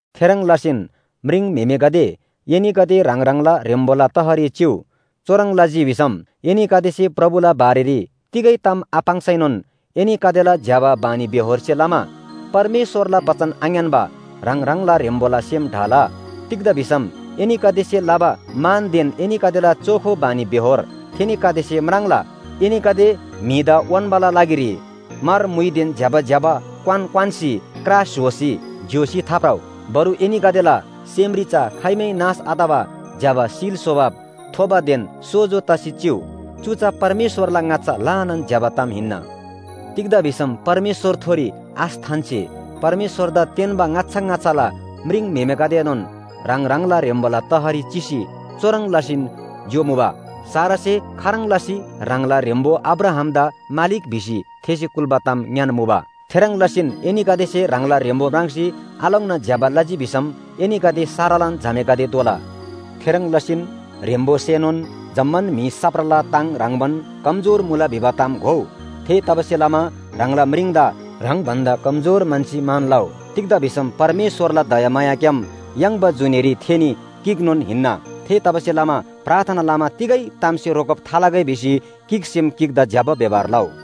थेह्रङ् लसीन म्रिङम्‍हेमेगदे, एनीगदे ह्राङ ह्राङला ह्रेम्‍बोला तहरी चिउ। चुह्रङ् लजी भिसम एनीगदेसे प्रभुला बारेरी तिगै ताम आपाङ्सैनोन एनीगदेला ज्‍यबा बानीबेहोरसे लमा परमेश्‍वरला बचन आङ्‌यान्‍बा ह्राङ ह्राङला ह्रेम्‍बोला सेम ढाला। तिग्‍दा भिसम एनीगदेसे लबा मानदेन एनीगदेला चोखो बानीबेहोर थेनीगदेसे म्राङ्ला। एनीगदे म्‍हिदा उन्‍बाला लागिरी म्‍हर म्‍हुइदेन ज्‍यबा ज्‍यबा क्‍वान क्‍वान्‍सी क्रा स्‍होसी ज्‍योसी थाभ्रउ। बरु एनीगदेला सेमरी चा खाइमै नाश आतबा ज्‍यबा शीलस्‍वभाव थोबादेन सोजो तसी चिउ। चु चा परमेश्‍वरला ङाच्‍छा ल्‍हानान ज्‍यबा ताम हिन्‍ना। तिग्‍दा भिसम परमेश्‍वरथोरी आश थान्‍सी परमेश्‍वरदा तेन्‍बा ङाच्‍छा ङाच्‍छाला म्रिङम्‍हेमेगदेएनोन ह्राङ ह्राङला ह्रेम्‍बोला तहरी चिसी चुह्रङ् लसीन ज्‍योमुबा। सारासे खाह्रङ् लसी ह्राङला ह्रेम्‍बो अब्राहामदा मालिक भिसी थेसे कुल्‍बा ताम ङ्‌यान्‍मुबा। थेह्रङ् लसीन एनीगदेसे ह्राङला ह्रेम्‍बो म्राङ्सी आलोङ्ना ज्‍यबा लजी भिसम एनीगदे सारालान झामेगदे दोला। थेह्रङ् लसीन ह्रेम्‍बोसेनोन जम्‍मान म्‍हि साप्राला ताङ ह्रङ्‌बान कमजोर मुला भिबा ताम घोउ। थेतबासेलमा ह्राङला म्रिङदा ह्राङ भन्‍दा कमजोर म्‍हन्‍सी मान लउ। तिग्‍दा भिसम परमेश्‍वरला दयामायाग्‍याम याङ्बा जुनीरी थेनी गिकनोन हिन्‍ना। थेतबासेलमा प्रार्थना लमा तिगै तामसे रोकब थालगै भिसी गिकसेम गिकदा ज्‍यबा व्‍यवहार लउ।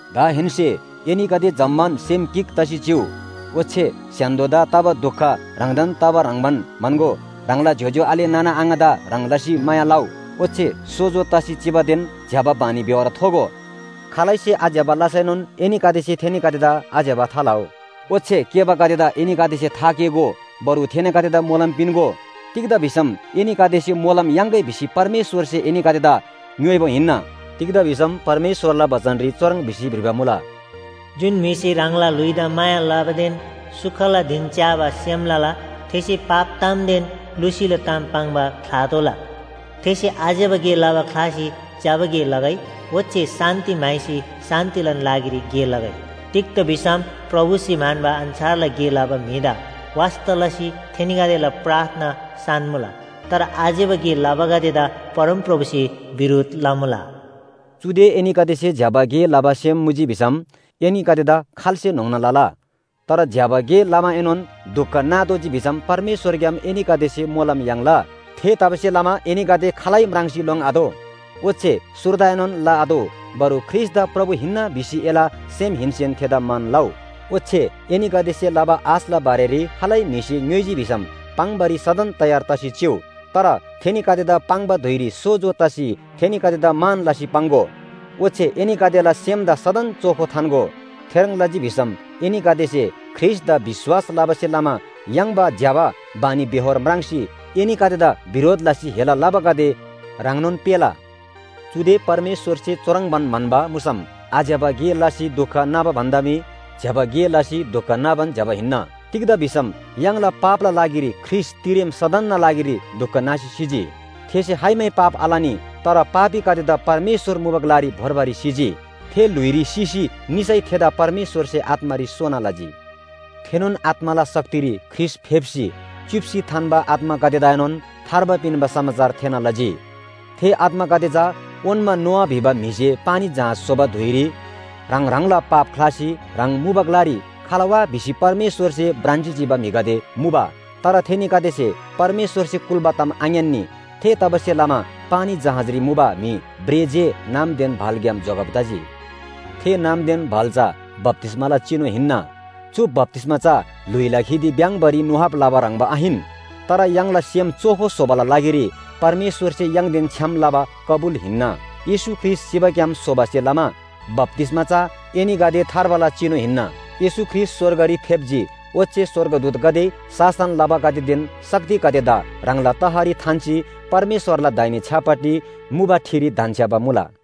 दाहेन्‍से एनीगदे जम्‍मान सेम गिक तसी चिउ। ओच्‍छे स्‍य्‍हान्‍दोदा तबा दुख ह्राङदान तबा ह्रङ्‌बान म्‍हन्‍गो, ह्राङला ज्‍योज्‍यो आले नाना आङादा ह्रङ् लसी माया लउ ओच्‍छे सोजो तसी चिबादेन ज्‍यबा बानीबेहोर थोगो। खालैसे आज्‍यबा लसैनोन एनीगदेसे थेनीगदेदा आज्‍यबा थालउ। ओच्‍छे केःबागदेदा एनीगदेसे थाकेःगो। बरु थेनीगदेदा मोलम पिन्‍गो। तिग्‍दा भिसम एनीगदेसे मोलम याङ्‌गै भिसी परमेश्‍वरसे एनीगदेदा ङ्‌योइबा हिन्‍ना। तिग्‍दा भिसम परमेश्‍वरला बचनरी चुह्रङ् भिसी भ्रिबा मुला, “जुन म्‍हिसे ह्राङला ल्‍हुइदा माया लबादेन सुखला धिन च्‍याबा सेम लला थेसे पाप तामदेन लुसीला ताम पाङ्बा ख्‍लातोःला। थेसे आज्‍यबा गे लबा ख्‍लासी ज्‍यबा गे लगै, ओच्‍छे शान्‍ति म्‍हाइसी शान्‍तिलान लागिरी गे लगै। तिग्‍दा भिसम प्रभुसे म्‍हन्‍बा अन्‍छारला गे लबा म्‍हिदा वास्‍ता लसी थेनीगदेला प्रार्थना सान्‍‍मुला। तर आज्‍यबा गे लबागदेदा परमप्रभुसे बिरोध लमुला।” चुदे एनीगदेसे ज्‍यबा गे लबा सेम मुजी भिसम एनीगदेदा खाल्‍से न्‍होङ्ना लला? तर ज्‍यबा गे लमाएनोन दुख नातोःजी भिसम परमेश्‍वरग्‍याम एनीगदेसे मोलम याङ्ला। थेतबासेलमा एनीगदे खालै म्राङ्सी लोङ्आतोः, ओच्‍छे सुर्दाएनोन लआतोः। बरु ख्रीष्‍टदा प्रभु हिन्‍ना भिसी एला सेमहेन्‍सेन थेदा मान लउ। ओच्‍छे एनीगदेसे लबा आशला बारेरी खालै म्‍हिसे ङ्‌योइजी भिसम पाङ्‌बारी सदन तयार तसी चिउ। तर थेनीगदेदा पाङ्बा धुइरी सोजो तसी थेनीगदेदा मान लसी पाङ्‍गो। ओच्‍छे एनीगदेला सेमदा सदन चोखो थान्‍गो। थेह्रङ् लजी भिसम एनीगदेसे ख्रीष्‍टदा विश्‍वास लबासे लमा याङ्बा ज्‍यबा बानीबेहोर म्राङ्सी एनीगदेदा बिरोध लसी हेला लबागदे ह्राङनोन पेःला। चुदे परमेश्‍वरसे चुह्रङ्बान म्‍हन्‍बा मुसम आज्‍यबा गे लसी दुख नाबा भन्‍दा मी ज्‍यबा गे लसी दुख नाबान ज्‍यबा हिन्‍ना। तिग्‍दा भिसम य्‍हाङला पापला लागिरी ख्रीष्‍ट तिरेम सदनना लागिरी दुख नासी सिजी। थेसे खाइमै पाप आलनी, तर पापीगदेदा परमेश्‍वर मुबा ग्‍लारी भोर्बारी सिजी। थे ल्‍हुइरी सिसी निसै थेदा परमेश्‍वरसे आत्‍मारी सोना लजी। थेनोन आत्‍माला शक्तिरी ख्रीष्‍ट फेप्‍सी च्‍युप्‍सी थान्‍बा आत्‍मागदेदाएनोन थार्बा पिन्‍बा समाचार थेःना लजी। थे आत्‍मागदे चा ओन्‍मा नोआ भिबा म्‍हिसे पानी जहाज स्‍होबा धुइरी ह्राङ ह्राङला पाप ख्‍लासी ह्राङ मुबा ग्‍लारी खला वा भिसी परमेश्‍वरसे भ्रान्‍सी चिबा म्‍हिगदे मुबा। तर थेनीगदेसे परमेश्‍वरसे कुल्‍बा ताम आङ्‌यान्‍नी। थेतबासेलमा पानी जहाजरी मुबा म्‍हि भ्रे जे नामदेन भालग्‍याम जोगब तजी। थे नामदेन भाल चा बप्‍तिस्‍माला चिनु हिन्‍ना। चु बप्‍तिस्‍मा चा ल्‍हुइला खिदि भ्‍याङ्बारी नुहाब लबा ह्रङ्‌बा आहिन, तर य्‍हाङला सेम चोखो स्‍होबाला लागिरी परमेश्‍वरसे य्‍हाङदेन छ्‌याम लबा कबुल हिन्‍ना। येशू ख्रीष्‍ट सिबाग्‍याम सोबासे लमा बप्‍तिस्‍मा चा एनीगदे थार्बाला चिनु हिन्‍ना। येशू ख्रीष्‍ट स्‍वर्गरी फेप्‍जी, ओच्‍छे स्‍वर्गदूतगदे, शासन लबागदेदेन शक्तिगदेदा ह्राङला तहरी थान्‍सी परमेश्‍वरला दाहिने छ्‌यापट्टि मुबा ठिरी धन्‍छ्‌याबा मुला।